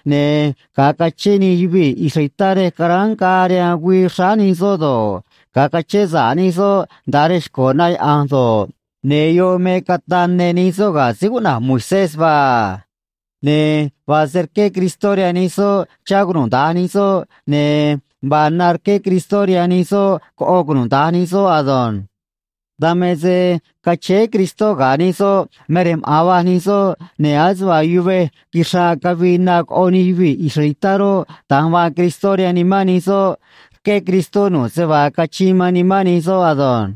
ne̱ ga̱a cachén nij yuvii̱ israelitá rej caráán ngaa rihaan güii xráá nij soꞌ do̱ꞌ, ga̱a cachén sa̱ꞌ nij soꞌ nda̱a rej xco̱ na yaꞌa̱nj do̱ꞌ, ne̱ yoꞌ me cataꞌ ne nij soꞌ ga̱ síí cuꞌna̱j Moisés vaa a. Ne̱ vaa se rqué Cristó rihaan nij soꞌ chá cunuda̱nj nij soꞌ, ne̱ vaa na rqué Cristó rihaan nij soꞌ coꞌo cunuda̱nj nij soꞌ ado̱nj. Dan me se cachéé Cristó ga̱ nij soꞌ me rej maꞌa̱n va̱j nij soꞌ, ne̱ ase vaa yuvej quixraꞌ cavii na coꞌo nij yuvii̱ israelitá roꞌ, da̱nj vaa Cristó rihaan nimán nij soꞌ, rqué Cristó nu̱ꞌ se vaa cachiin man nimán nij soꞌ ado̱nj.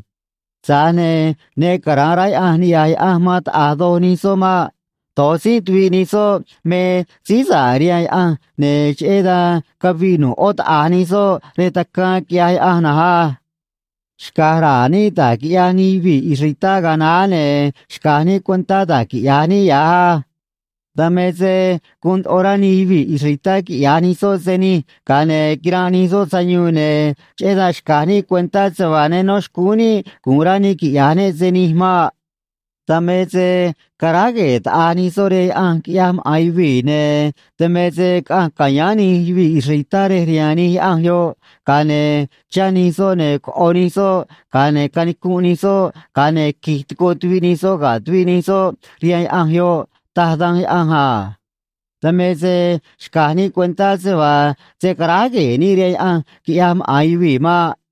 Tza̱j ne̱ ne cara̱nꞌ rá Yaꞌanj ni̱ꞌyaj Yaꞌanj man taꞌa̱j doj nij soꞌ maꞌ. Do̱j tzínꞌ tuviꞌ nij soꞌ me síí sa̱ꞌ rihaan Yaꞌanj, ne̱ cheꞌé dan caviꞌ nu̱ꞌ ꞌó taꞌa̱j nij soꞌ rej tacaan, quiꞌyaj Yaꞌanj na̱nj á. Xca̱j ra̱a̱ níꞌ da̱j quiꞌyaj nij yuvii̱ israelitá ga̱a naá, ne̱ xca̱j níꞌ cuentá da̱j quiꞌya̱j níꞌ ya̱j á. Dan me se guun ndoꞌo rá nij yuvii̱ israelitá quiꞌya̱j nij soꞌ se nij, ga̱a ne̱ quiranꞌ nij soꞌ sayuun, ne̱ cheꞌé dan xca̱j níꞌ cuentá se vaa ne nó xcúún níꞌ gu̱un rá níꞌ quiꞌya̱j níꞌ se nij maꞌ. Dan me se caráj gue̱e̱ taꞌa̱j nij soꞌ rihaan yaꞌanj quiꞌyaj maꞌa̱n yuvii̱, ne̱ dan me se caꞌanj ca̱yáán nij yuvii̱ israelitá rej rihaan nij yaꞌanj yoꞌ, ga̱a ne̱ chá nij soꞌ ne̱ coꞌo nij soꞌ, ga̱a ne̱ canicunꞌ nij soꞌ, ga̱a ne̱ qui̱j tico tuviꞌ nij soꞌ ga̱ tuviꞌ nij soꞌ rihaan yaꞌanj yoꞌ, taj Danj Yaꞌanj a. Dan me se xca̱j níꞌ cuentá se vaa se̱ caráj gue̱e̱ níꞌ rihaan yaꞌanj quiꞌyaj maꞌa̱n yuvii̱ maꞌ.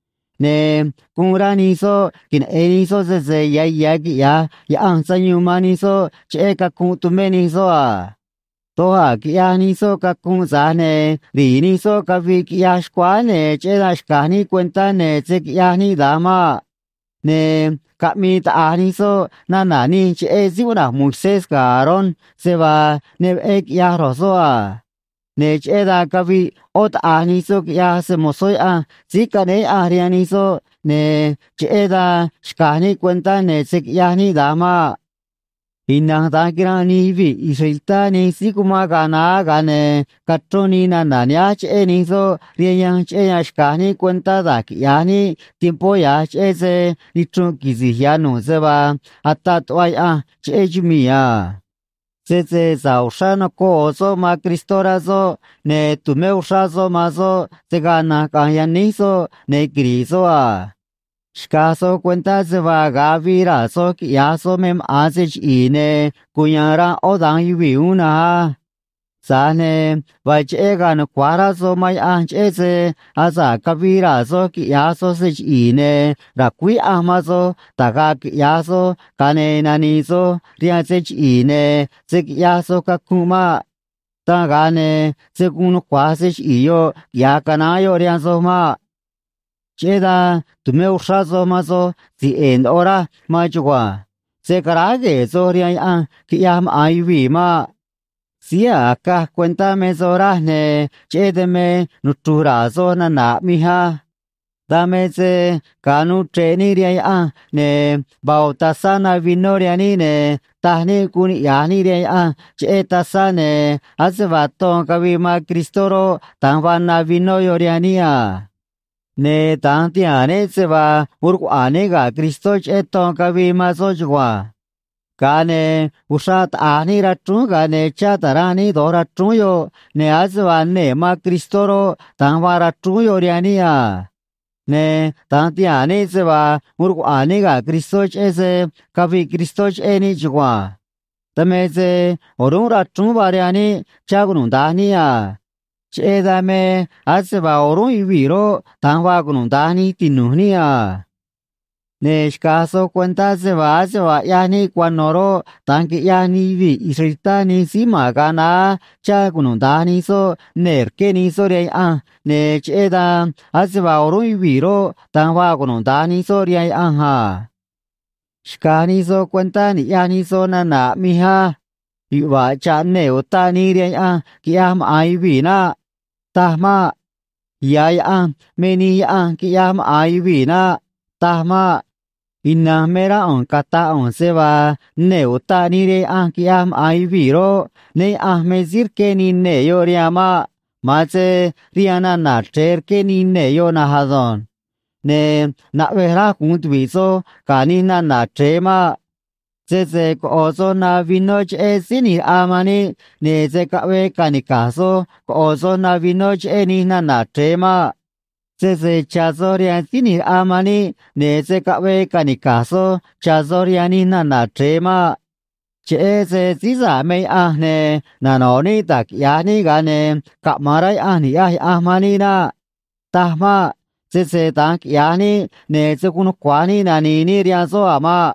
Ne̱ guun rá nij soꞌ queneꞌe̱n nij soꞌ sese ya̱ ya̱ quiꞌya̱j Yaꞌanj sayuun man nij soꞌ cheꞌé cacunꞌ tumé nij soꞌ a. Doj a̱ quiꞌyaj nij soꞌ cacunꞌ, tza̱j ne̱ ri̱i̱ nij soꞌ caviꞌ, quiꞌyaj xcuáá, ne̱ cheꞌé dan xca̱j níꞌ cuentá, ne̱ se̱ quiꞌyaj níꞌ da̱nj maꞌ. Ne̱ caꞌmii taꞌa̱j nij soꞌ nana̱ nij cheꞌé síí cuꞌna̱j Moisés ga̱ Aarón, se vaa ne veꞌé quiꞌyaj ro̱j soꞌ a. Ne̱ cheꞌé dan caviꞌ ꞌó taꞌa̱j nij soꞌ, quiꞌyaj se‑mo̱zó Yaꞌanj síí caꞌnéé Yaꞌanj rihaan nij soꞌ, ne̱ cheꞌé dan xca̱j níꞌ cuentá, ne̱ se̱ quiꞌyaj níꞌ da̱nj maꞌ. Ina̱nj da̱nj quiranꞌ nij yuvii̱ israelitá nij síí cumán ga̱a naá, ga̱a ne̱ cachrón nii nana̱ nihánj cheꞌé nij soꞌ rihaan yanj, cheꞌé yan xca̱j níꞌ cuentá da̱j quiꞌya̱j níꞌ tiempó ya̱j, cheꞌé se nichrunꞌ quisi̱j ya̱ nu̱ꞌ se vaa ataꞌ tuꞌva Yaꞌanj cheꞌé chumii̱ a. Sese sa̱ꞌ uxrá nocoꞌ ꞌo̱ soꞌ man Cristó rá soꞌ, ne̱ tu̱mé uxrá soꞌ man soꞌ se̱ gaa na̱nj caꞌa̱nj yaníj soꞌ ne̱ quiri̱ꞌ soꞌ a. Xca̱j soj cuentá se vaa ga̱a avii raa̱ soj quiꞌya̱j soj me maꞌa̱n se chiꞌi̱i̱, ne̱ cuya̱a̱n ranꞌ ꞌó da̱nj yuvii̱ uún na̱nj á. Tza̱j ne̱ vaa cheꞌé ga̱a̱ nucua̱j rá soj man Yaꞌanj, cheꞌé se asa̱ꞌ cavii raa̱ soj quiꞌya̱j soj se chiꞌi̱i̱, ne̱ ra̱cuíj Yaꞌanj man soj da̱j ga̱a̱ quiꞌya̱j soj, ga̱a ne̱ nani̱i̱ soj rihaan se chiꞌi̱i̱, ne̱ se̱ quiꞌyaj soj cacunꞌ maꞌ. Dan ga̱a ne̱ se̱ guun nucua̱j se chiꞌi̱i̱ yoꞌ quiꞌya̱j canaán yoꞌ rihaan soj maꞌ. Cheꞌé dan tu̱mé uxrá soj man soj si̱j ꞌe̱e̱ ndoꞌo raj man chugua̱nj. Se̱ caráj gue̱e̱ soj rihaan yaꞌanj quiꞌyaj maꞌa̱n yuvii̱ maꞌ. Síí a̱j acaj cuentá me soj, raj, ne̱ cheꞌé dan me nuchru̱j ra̱a̱ soj nana̱ aꞌmij á. Dan me se ga̱a nuu chre̱ꞌ níꞌ rihaan Yaꞌanj, ne̱ vaa ꞌo̱ tazá na vinó rihaan níꞌ, ne̱ taj níꞌ guun niꞌya̱j níꞌ rihaan Yaꞌanj cheꞌé tazá, ne̱ ase vaa ton cavii man Cristó roꞌ, da̱nj vaa na vinó yoꞌ rihaan níꞌ a. Ne̱ da̱nj tihaa̱n níꞌ se vaa uun rcuaꞌa̱a̱n níꞌ ga̱ Cristó cheꞌé ton cavii man soꞌ chugua̱nj. Ga̱a ne̱ uxraꞌ taꞌa̱j níꞌ rachrúún, ga̱a ne̱ chá ta̱ranꞌ níꞌ do̱j rachrúún yoꞌ, ne̱ ase vaa nee̱ man Cristó roꞌ, da̱nj vaa rachrúún yoꞌ rihaan níꞌ a. Ne̱ da̱nj tihaa̱n níꞌ se vaa uun rcuaꞌa̱a̱n níꞌ ga̱ Cristó cheꞌé se caviꞌ Cristó cheꞌé níꞌ chugua̱nj. Dan me se o̱rúnꞌ rachrúún vaa rihaan níꞌ chá cunuda̱nj níꞌ a. Cheꞌé dan me ase vaa o̱rúnꞌ yuvii̱ roꞌ, da̱nj vaa cunuda̱nj nij tinu̱j níꞌ a. Ne̱ xca̱j soj cuentá se vaa ase vaa ꞌyaj níꞌ cuano̱ roꞌ, da̱nj quiꞌyaj nij yuvii̱ israelitá nij síí ma̱n ga̱a naá, chá cunuda̱nj nij soꞌ nee̱ rqué nij soꞌ rihaan Yaꞌanj, ne̱ cheꞌé dan ase vaa o̱rúnꞌ yuvii̱ roꞌ, da̱nj vaa cunuda̱nj nij soꞌ rihaan Yaꞌanj a. Xca̱j nij soj cuentá ni̱ꞌyaj nij soj nana̱ aꞌmij á. Yuꞌva̱ꞌ cha̱ꞌ nee̱ utaꞌ nii rihaan yaꞌanj quiꞌyaj maꞌa̱n yuvii̱ naꞌ. Taj maꞌ. Ya̱ yaꞌanj me nij yaꞌanj quiꞌyaj maꞌa̱n yuvii̱ naꞌ. Taj maꞌ. Ina̱nj me rá ꞌu̱nj cata̱j ꞌu̱nj se vaa nee̱ utaꞌ nii rihaan yaꞌanj quiꞌyaj maꞌa̱n yuvii̱ roꞌ, né Yaꞌa̱nj me síí rqué nii nee̱ yoꞌ rihaan maꞌ. Ma̱an se rihaan nana̱ chre̱e rqué nii nee̱ yoꞌ na̱nj ado̱nj. Ne̱ naꞌvej raj gu̱un tuvi̱ꞌ soj ga̱ nij nana̱ chre̱e maꞌ. Sese coꞌo̱ soj na vinó cheꞌé Síí ꞌNi̱j Raꞌa man níꞌ, ne̱ se̱ caꞌvee ca̱nica̱j soj coꞌo̱ soj na vinó cheꞌé nij nana̱ chre̱e maꞌ. Sese cha̱ soj rihaan Síí ꞌNi̱j Raꞌa man níꞌ, ne̱ se̱ caꞌvee ca̱nica̱j soj cha̱ soj rihaan nij nana̱ chre̱e maꞌ. Cheꞌé se síí sa̱ꞌ me Yaꞌanj, ne̱ nano̱ꞌ níꞌ da̱j quiꞌya̱j níꞌ, ga̱a ne̱ caꞌma̱an rá Yaꞌanj ni̱ꞌyaj Yaꞌanj man níꞌ naꞌ. Taj maꞌ. Sese da̱nj quiꞌya̱j níꞌ, ne̱ se̱ guun nucua̱j níꞌ nani̱i̱ níꞌ rihaan soꞌ a̱ maꞌ.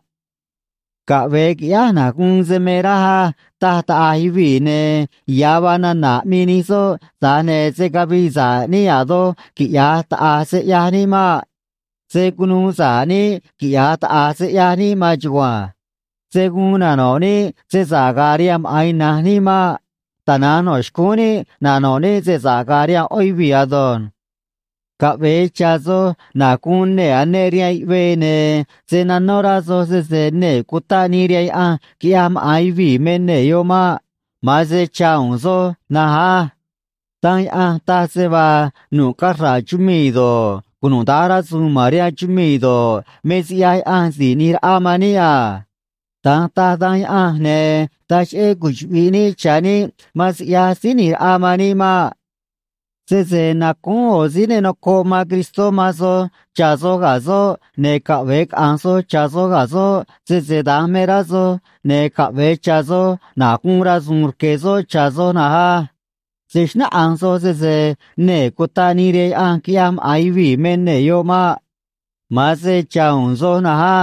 “Caꞌve̱e qui̱ꞌyáj na̱j guun se me raj á”, taj taꞌa̱j yuvii̱, ne̱ ya̱ vaa nana̱ aꞌmii nij soꞌ, tza̱j ne̱ se̱ cavii sa̱ꞌ níꞌ a̱ doj, quiꞌya̱j taꞌa̱j se ꞌyaj níꞌ maꞌ. Se̱ cunuu sa̱ꞌ níꞌ, quiꞌya̱j taꞌa̱j se ꞌyaj níꞌ maan chugua̱nj. Se̱ guun nano̱ꞌ níꞌ se sa̱ꞌ ga̱a̱ rihaan maꞌa̱n ina̱nj níꞌ maꞌ. Tana̱nj no̱ xcúún níꞌ nano̱ꞌ níꞌ se sa̱ꞌ ga̱a̱ rihaan ꞌó yuvii̱ ado̱nj. Caꞌve̱e cha̱ soj na̱j guun nee̱ aneꞌ rihaan yuꞌvee, ne̱ se̱ nanó rá soj sese nee̱ cutaꞌ nii rihaan yaꞌanj quiꞌyaj maꞌa̱n yuvii̱ me nee̱ yoꞌ maꞌ. Ma̱an se cha̱ u̱u̱n soj na̱nj á. Danj Yaꞌanj taj se vaa nu̱ꞌ cachra̱ꞌ chumii̱ do̱ꞌ, cunuda̱nj rasu̱u̱n ma̱n rihaan chumii̱ do̱ꞌ, me siꞌyaj Yaꞌanj Si̱j ꞌNi̱j Raꞌa man níꞌ a. Da̱nj taj Danj Yaꞌanj, ne̱ taj cheꞌé cuchuꞌvi̱ꞌ níꞌ cha̱ níꞌ man siꞌyaj Síí ꞌNi̱j Raꞌa man níꞌ maꞌ. Sese nacúún ꞌo̱ síí ne nocoꞌ man Cristó man soj cha̱ soj ga̱ soꞌ, ne̱ caꞌve̱e caꞌa̱nj soj cha̱ soj ga̱ soꞌ, sese da̱nj me rá soj, ne̱ caꞌve̱e cha̱ soj na̱j guun rasu̱u̱n rque̱ soꞌ cha̱ soj na̱nj á. Se̱ xnáꞌanj soj sese nee̱ cutaꞌ nii rihaan yaꞌanj quiꞌyaj maꞌa̱n yuvii̱ me nee̱ yoꞌ maꞌ. Ma̱an se cha̱ u̱u̱n soj na̱nj á.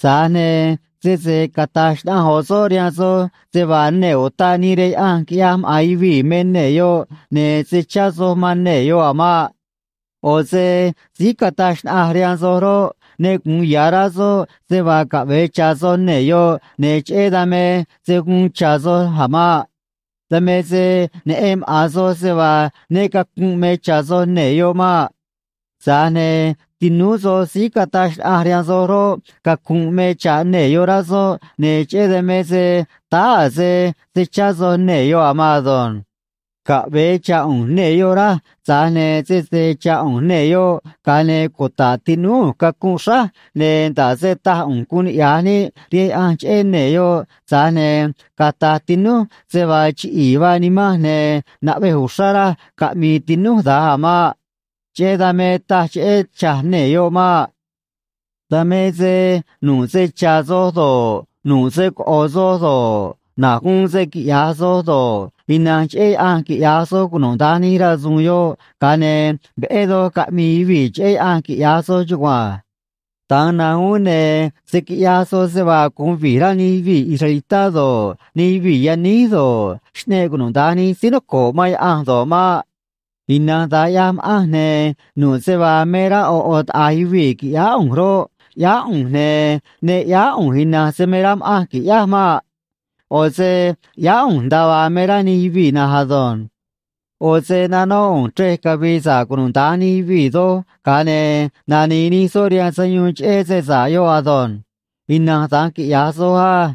Tza̱j ne̱ sese cata̱j xnaꞌanj ꞌo̱ soꞌ rihaan soj se vaa nee̱ utaꞌ nii rihaan yaꞌanj quiꞌyaj maꞌa̱n yuvii̱ me nee̱ yoꞌ, ne̱ se̱ chá soj man nee̱ yoꞌ a̱ maꞌ. ꞌO̱ se síí cataj xnaꞌanj rihaan soj roꞌ, ne gu̱un ya̱ rá soꞌ se vaa caꞌve̱e cha̱ soj nee̱ yoꞌ, ne̱ cheꞌé dan me se̱ guun cha̱ soj a̱ maꞌ. Dan me se neꞌen maꞌa̱n soj se vaa né cacu̱nꞌ me cha̱ soj nee̱ yoꞌ maꞌ. Tza̱j ne̱ tinúú soj síí cataj xnaꞌanj rihaan soj roꞌ, cacunꞌ me cha̱ꞌ nee̱ yoꞌ, rá soꞌ, ne̱ cheꞌé dan me se táá a̱ se se̱ chá soj nee̱ yoꞌ a̱ maan ado̱nj. Caꞌve̱e cha̱ ꞌu̱nj nee̱ yoꞌ, raj, tza̱j ne̱ sese cha̱ ꞌu̱nj nee̱ yoꞌ, ga̱a ne̱ cuta̱ꞌ tinúú ꞌu̱nj cacunꞌ xráj, ne̱ nda̱ꞌ se taj ꞌu̱nj guun niꞌya̱j níꞌ rihaan Yaꞌanj cheꞌé nee̱ yoꞌ, tza̱j ne̱ cata̱j tinúj se vaa chiꞌi̱i̱ vaa nimanj, ne̱ naꞌvej uxrá raj caꞌmi̱i̱ tinúj da̱nj a̱ maꞌ. Cheꞌé dan me taj cheꞌé cha̱j nee̱ yoꞌ maꞌ. Dan me se nu̱ꞌ se cha̱ soj do̱ꞌ, nu̱ꞌ se coꞌo̱ soj do̱ꞌ, na̱j guun se quiꞌya̱j soj do̱ꞌ, ina̱nj cheꞌé Yaꞌanj quiꞌya̱j soj cunuda̱nj nij rasu̱u̱n yoꞌ, ga̱a ne̱ veꞌé doj caꞌmi̱i̱ yuvii̱ cheꞌé Yaꞌanj, quiꞌya̱j soj chugua̱nj. Da̱nj na̱nj uún, ne̱ se̱ quiꞌyaj soj se vaa gu̱un vi̱j rá nij yuvii̱ israelitá do̱ꞌ, nij yuvii̱ yaníj do̱ꞌ, xꞌneꞌ cunuda̱nj nij síí noco̱ꞌ man Yaꞌanj do̱ꞌ maꞌ. Ina̱nj da̱nj ꞌyaj ma̱ꞌanj, ne̱ nu̱ꞌ se vaa me rá ꞌo̱ ꞌo̱ taꞌa̱j yuvii̱ qui̱ꞌyáá ꞌu̱nj roꞌ, ꞌyáá ꞌu̱nj, ne̱ ne ꞌyáá ꞌu̱nj ina̱nj se me raj ma̱ꞌanj qui̱ꞌyáj maꞌ. ꞌO̱ se ꞌyáá ꞌu̱nj nda̱a vaa me rá nij yuvii̱ na̱nj ado̱nj. ꞌO̱ se nanóꞌ ꞌu̱nj chrej cavi̱i̱ sa̱ꞌ cunuda̱nj nij yuvii̱ doj, ga̱a ne̱ nani̱i̱ nij soꞌ rihaan sayuun cheꞌé se sa̱ꞌ yoꞌ ado̱nj. Ina̱nj da̱nj quiꞌya̱j soj á.